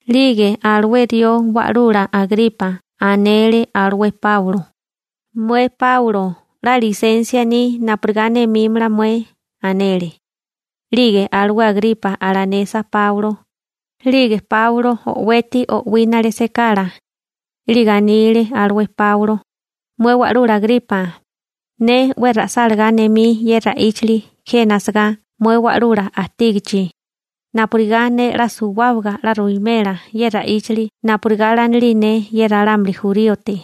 'Lige alué rió wa'lula Agripa anele alué Páulo: ―Mué Páulo 'la lisensia ni napurigá nemímala mué ―anele. 'Lige alué Agripa alanesa Páulo 'lige Páulo o'weti o'wínale sekala, 'lige anile alué Páulo: ―Mué wa'lula Agripa, ne 'we ra'sálagá nemí ye ra'íchili jena asagá mué wa'lula ajtígichi, napurigá ne 'la suwábaga 'la ruwimela ye ra'íchili napurigá lanilí ne ye ralámuli juríote.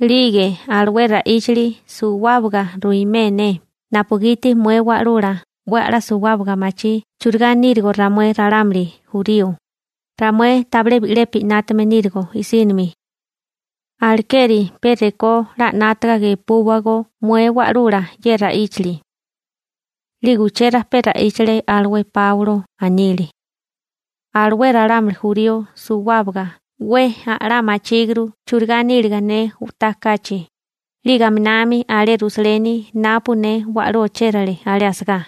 'Lige alué ra'íchili suwábaga ruimé ne napugiti mué wa'lula 'we a'lá suwábaga machí churigá nírigo ramué ralámuli jurío, ramué tabilé bi'lepi 'nátame nírigo i'sínimi. Alekeri pe rekó 'la 'nátaga gepúwagó mué wa'lula ye ra'íchili. 'Lige uché rajpé ra'íchale alué Páulo, anile: ―Alué ralámuli jurío suwábaga 'we a'lá machíguru churigá níliga ne u'tá kachi, 'lige aminami alé Rusaleni napu ne wa'lú ochérale alé asagá.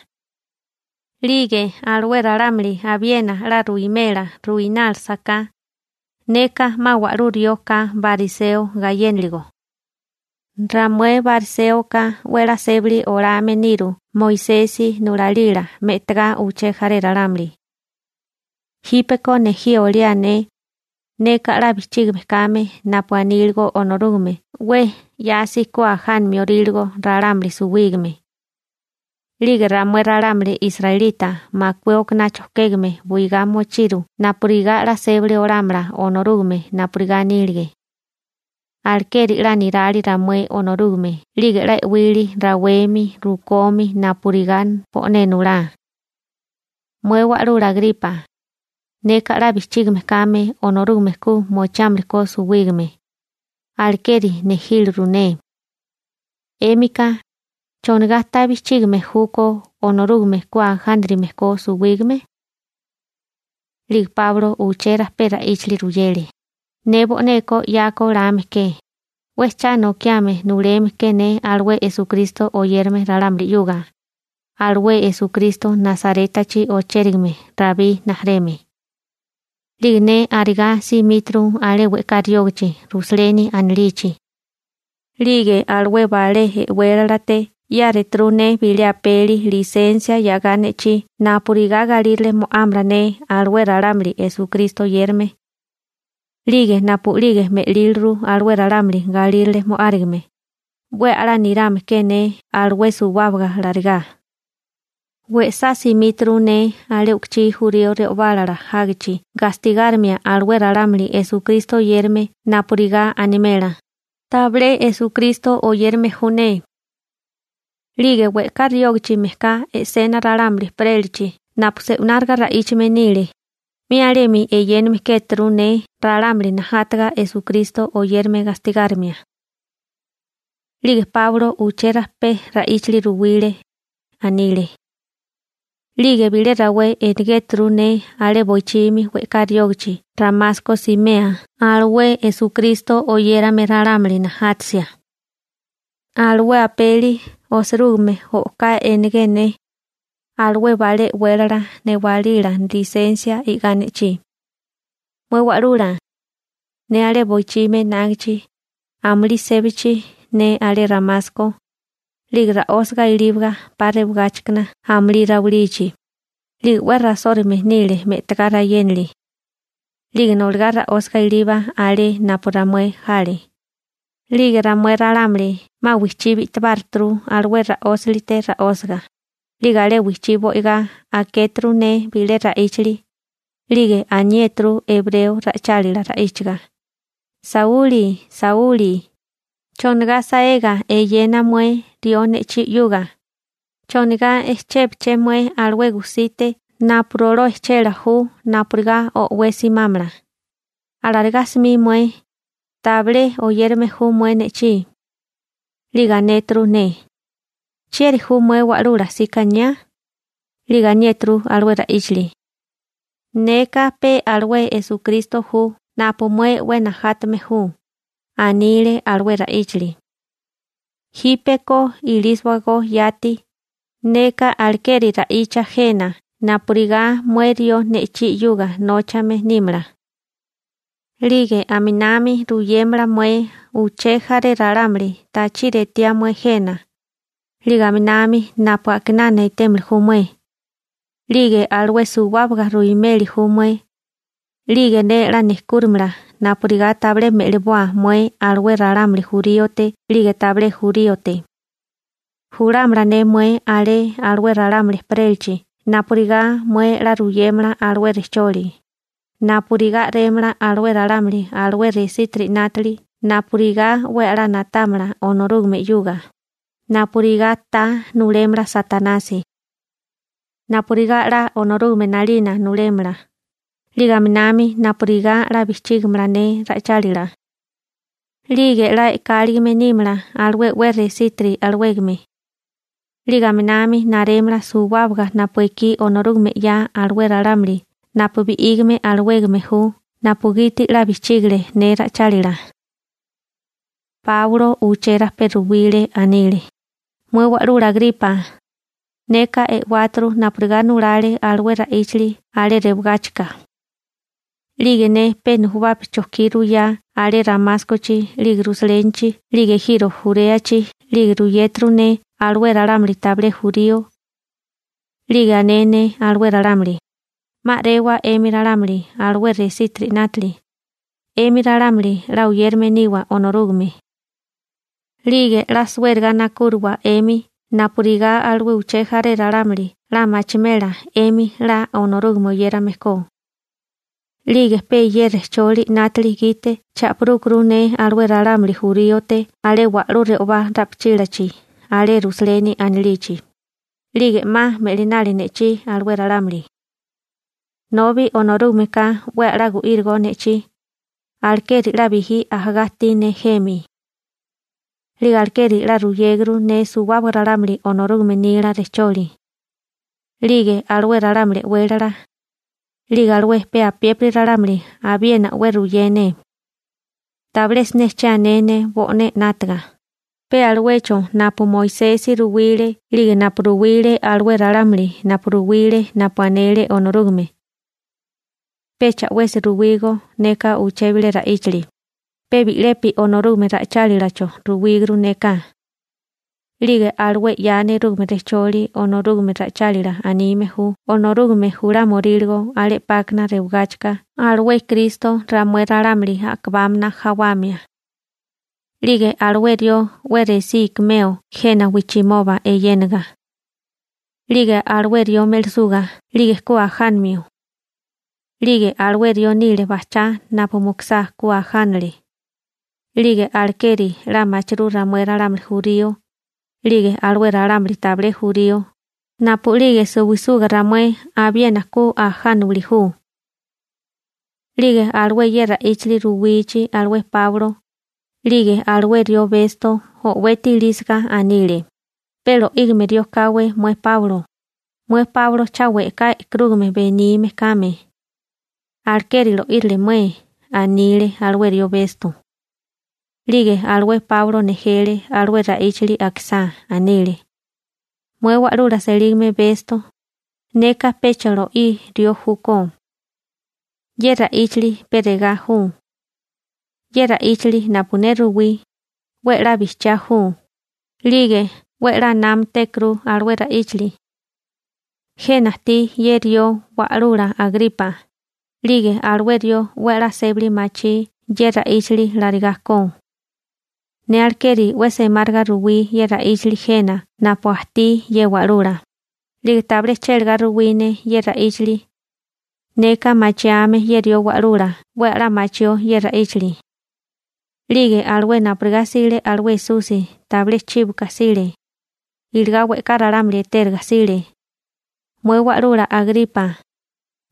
'Lige alué ralámuli abiena 'la ruwimela ruinálasaká, neka 'ma wa'lú rió ka bariseo gayénaligo. Ramué bariséoka 'we 'la sébali olame niru Moisesi nulalila me'tagá uché jaré ralámuli. Jípeko nejí oliá ne, neka 'la bijchígame kame napu aníligo Onorúgame 'we 'yasi ku ajánamio oríligo ralámuli suwígame. 'Lige ramué ralámuli israelita makué okaná chojkégame buigá mochiru napurigá 'la sébali olámala Onorúgame napurigá anílige. Alekeri 'la nirali ramué Onorúgame 'lige 'la e'wilí rawemi rukomi napurigá bo'né nulá. Mué wa'lula Agripa, neka 'la bijchígame kame Onorúgame ku mochiámili ko suwígame, alekeri nejíliru ne. 'Émika ¿chonigá ta bijchígame júkó Onorúgame ku ajánarime ko suwígame? 'Lige Páulo uché rajpé ra'íchili ruyele: ―Ne bo'neko 'yako lame ke, 'we cha nokiame nuleme ke ne alué Esukristo oyérame ralámuli 'yuga, alué Esukristo Nasarétachi ochérigame Rabí rijimala. 'Lige ne arigá simíturu alé we'ká riógichi Rusaleni anilichi. 'Lige alué balé e'wélalate 'yáreturu ne bilé apeli lisensia 'yagá ne'chí napurigá galírale mo'ámala ne alué ralámuli Esukristo oyérame. 'Lige napu'lige me'líliru alué ralámuli galírale mo'árigame, 'we a'lá nirame ke ne alué suwábaga larigá. We'sá simíturu ne alé u'kuchí jurío re'obálala jágichi gastigárimia alué ralámuli Esukristo oyérame napurigá animela: «Tabilé Esukristo oyérame ju ne.» 'Lige we'ká riógichi mejká e'sena ralámuli ejperélachi napu se'unáriga ra'íchame nile, 'mi alemi eyéname kéturu ne ralámuli najátaga Esukristo oyérame gastigárimia. 'Lige Páulo uché rajpé ra'íchili ruwile. Anile: ―'Lige bilé rawé enegéturu ne alé boichimi we'ká riógichi Ramasko simea alué Esukristo oyérame ralámuli najátasia. Alué apeli osirúgime o'ká enegé ne, alué balé e'wélala newálila lisensia i'gá ne'chí. Mué wa'lula, ne alé boichimi enágichi amulí sébachi ne alé Ramasko, 'lige ra'ósaga iliba 'pa rewagáchikana amulí rawilichi, 'lige 'we rasórume nile me'tagá rayénili. 'Lige noligá ra'ósiga iliba alé napu ramué jale. 'Lige ramué ralámuli 'ma wijchí bi'tibáruturu alué ra'ósalite rasoga. 'Lige alé wijchí bo'igá akéturu ne bilé ra'íchili. 'Lige aniéturu ebreo ra'ichálila ra'íchaga: «Sauli, Sauli, ¿chonigá saega eyena mué rió ne'chí 'yuga? ¿Chonigá echébaché mué alué gusite napu roló ejchela ju napurigá o'wé simámala? Alarigá simí mué, tabilé oyérame ju mué ne'chí.» 'Lige anéturu ne: «¿Chieri ju mué wa'lula sikaniá?» 'Lige aniéturu alué ra'íchili: «Neka pe alué Esukristo ju napu mué 'we najátame ju resí olániliga», anile alué ra'íchili. «Jípeko ilísiwagó yati, neka alekeri ra'icha jena napurigá mué rió ne'chí 'yuga nóchame nímala. 'Lige aminami ruyémela mué uché jaré ralámuli tachiri etiá mué jena, 'lige aminami napu a'kinana etémili ju mué, 'lige alué suwábaga ruimeli ju mué. 'Lige ne 'la nejkúrimala napurigá tabilé me'liboa mué alué ralámuli juríote 'lige tabilé juríote. Julámala ne mué alé alué ralámuli ejperélachi napurigá mué 'la ruyémala alué rejcholi, napurigá a'rémala alué ralámuli alué resítiri 'nátili napurigá 'we a'lá na'támala Onorúgame 'yuga, napurigá ta nulémala Satanasi, napurigá 'la Onorúgame 'nalina nulémala, 'lige aminami napurigá 'la bijchígimala ne ra'ichálila. 'Lige 'la e'káligime nímala alué 'we resítiri alawégame, 'lige aminami narémala suwábaga napu ekí Onorúgame 'ya alué ralámuli napu bi'ígame alawégame ju napugiti 'la bijchígile ne ra'ichálila.›› Páulo uché rajpé ruwile. Anele: ―Mué wa'lula Agripa, neka e'wáturu napurigá nulale alué ra'íchili alé rewagáchika. 'Lige ne pe nujubapi chojkí ruyá alé Ramáskochi 'lige Rusalénichi 'lige ejiro Juréachi 'lige ruyéturu ne alué ralámuli tabilé jurío. 'Lige ané ne alué ralámuli: «'Ma a'rewa 'emi ralámuli alué resítiri 'nátili, 'emi ralámuli 'la oyérame niwa Onorúgame. 'Lige 'la suériga nakúriwa 'emi napurigá alué uché jaré ralámuli 'la machimela 'emi 'la Onorúgame oyérame ko.» 'Lige pe ye rejcholi 'nátili gite cha'pirúkuru ne alué ralámuli juríote alé wa'lú re'obá ra'pichílachi alé Rusaleni anilichi, 'lige 'ma me'linali ne'chí alué ralámuli. Nobi Onorúgameka 'we a'lá gu'írigo ne'chí, alekeri 'la bijí ajagá ajtí ne jemi. 'Lige alekeri 'la ruyéguru ne suwábaga ralámuli Onorúgame nila rejcholi. 'Lige alué ralámuli e'wélala, 'lige alué pe apiépiri ralámuli abiena 'we ruyé ne. Tabilé siné che ané ne bo'né 'nátaga, pe aluecho napu Moisesi ruwile 'lige napu ruwile alué ralámuli napu ruwile napu anele Onorúgame. Pecha 'wesi ruwígó neka uché bilé ra'íchali, pe bi'lepi Onorúgame ra'ichálilacho ruwíguru neka. 'Lige alué 'ya nerúgame rejcholi Onorúgame ra'ichálila anime ju Onorúgame julámioríligo alé 'pákana rewagáchika alué Kristo ramué ralámuli a'kabámana jawamia. 'Lige alué rió 'we resí ikimeo jena wijchimoba eyénaga. 'Lige alué rió me'lisuga 'lige ku ajánamio. 'Lige alué rió nile bajchá napu mukusá ku ajánale. 'Lige alekeri 'la machirú ramué ralámuli jurío, 'lige alué ralámuli tabilé jurío, napu'lige suwisuga ramué abiena ku ajánawili ju. 'Lige alué ye ra'íchili ruwichi alué Páulo, 'lige alué rió Besto o'weti ilísiga anile: ―¡Pe lo'ígame rió káwé mué Páulo! Mué Páulo cha we'ká e'karúgame benime kame, alekeri lo'írile mué ―anile alué rió Besto. 'Lige alué Páulo nejele alué ra'íchili akisá. Anile: ―Mué wa'lula selígame Besto, neka pecha lo'í rió júkó. Ye ra'íchili pe regá ju. Ye ra'íchili napu ne ruwí, 'we 'la bijchiá ju, 'lige 'we 'la námatékuru alué ra'íchali. Jena ajtí ye rió wa'lula Agripa, 'lige alué rió 'we a'lá sébali machí ye ra'íchali larigá ko. Ne alekeri 'we semáriga ruwí ye ra'íchili jena napu ajtí ye wa'lula, 'lige tabilé chélagá ruwí ne ye ra'íchili. Neka machiame ye rió wa'lula 'we a'lá machió ye ra'íchili. 'Lige alué napurigá 'sile alué Esusi tabilé chíboka 'sile, iligá we'ká ralámuli etériga 'sile. Mué wa'lula Agripa,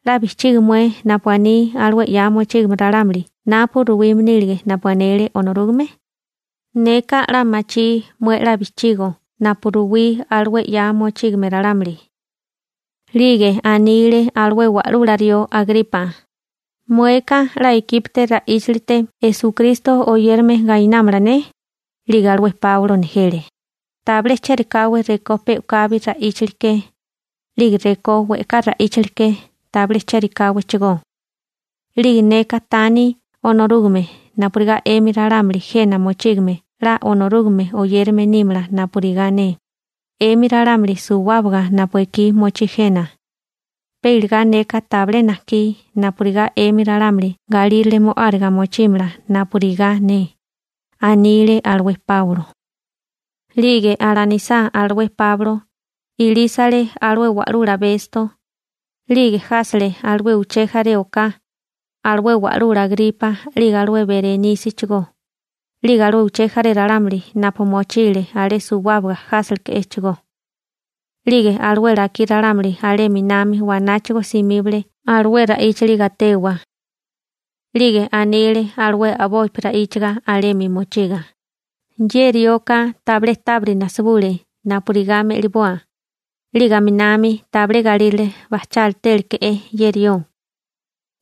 ¿'la bijchigi mué napu aní alué 'ya mochígame ralámuli napu ruwime nílige napu anele Onorúgame? Neka 'la machí mué 'la bijchigo napu ruwile alué 'ya mochígame ralámuli. 'Lige anile alué wa'lula rió Agripa: ―¿Mueka 'la ikípité ra'íchilite Esukristo oyérame gainámala ne? 'Lige alué Páulo nejele: ―Tabilé chérikáwé rekó pe u'kabi ra'íchili ke, 'lige rekó we'ká ra'íchili ke tabilé chérikáwéchigó. 'Lige neka tani Onorúgame napurigá 'emi ralámuli jena mochígame 'la Onorúgame oyérame nímala napurigá ne, 'emi ralámuli suwábaga napu ekí mochí jena, pe iligá neka tabilé najkí napurigá 'emi ralámuli galírale mo'áriga mochímala napurigá ne ―anile alué Páulo. 'Lige alanisá alué Páulo, ilísele alué wa'lula Besto, 'lige jásele alué uché jaré oká, alué wa'lula Agripa 'lige alué Berenísichigó, 'lige alué uché jaré ralámuli napu mochile alé suwábaga jáseleke'échigó. 'Lige alué lakí ralámuli alé 'minami wanáchigo simíbale alué ra'íchili gatewa. 'Lige anile alué a'bopi ra'íchaga alemi mochiga: ―Ye rioka tabilé tábiri najsibule napurigá me'liboa. 'Lige aminami tabilé galírale bajchátéleke'é ye rió,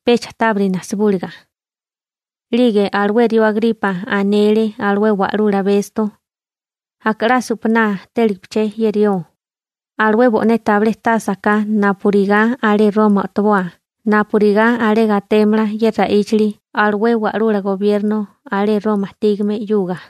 pecha tábiri najsibúliga. 'Lige alué rió Agripa anele alué wa'lula Besto: ―Aka 'la supaná téligipaché ye rió, alué bo'né tabilé tasa ka napurigá alé Roma o'toboa napurigá alé gatémala ye ra'íchali alué wa'lula gobierno alé Roma ajtígame 'yuga.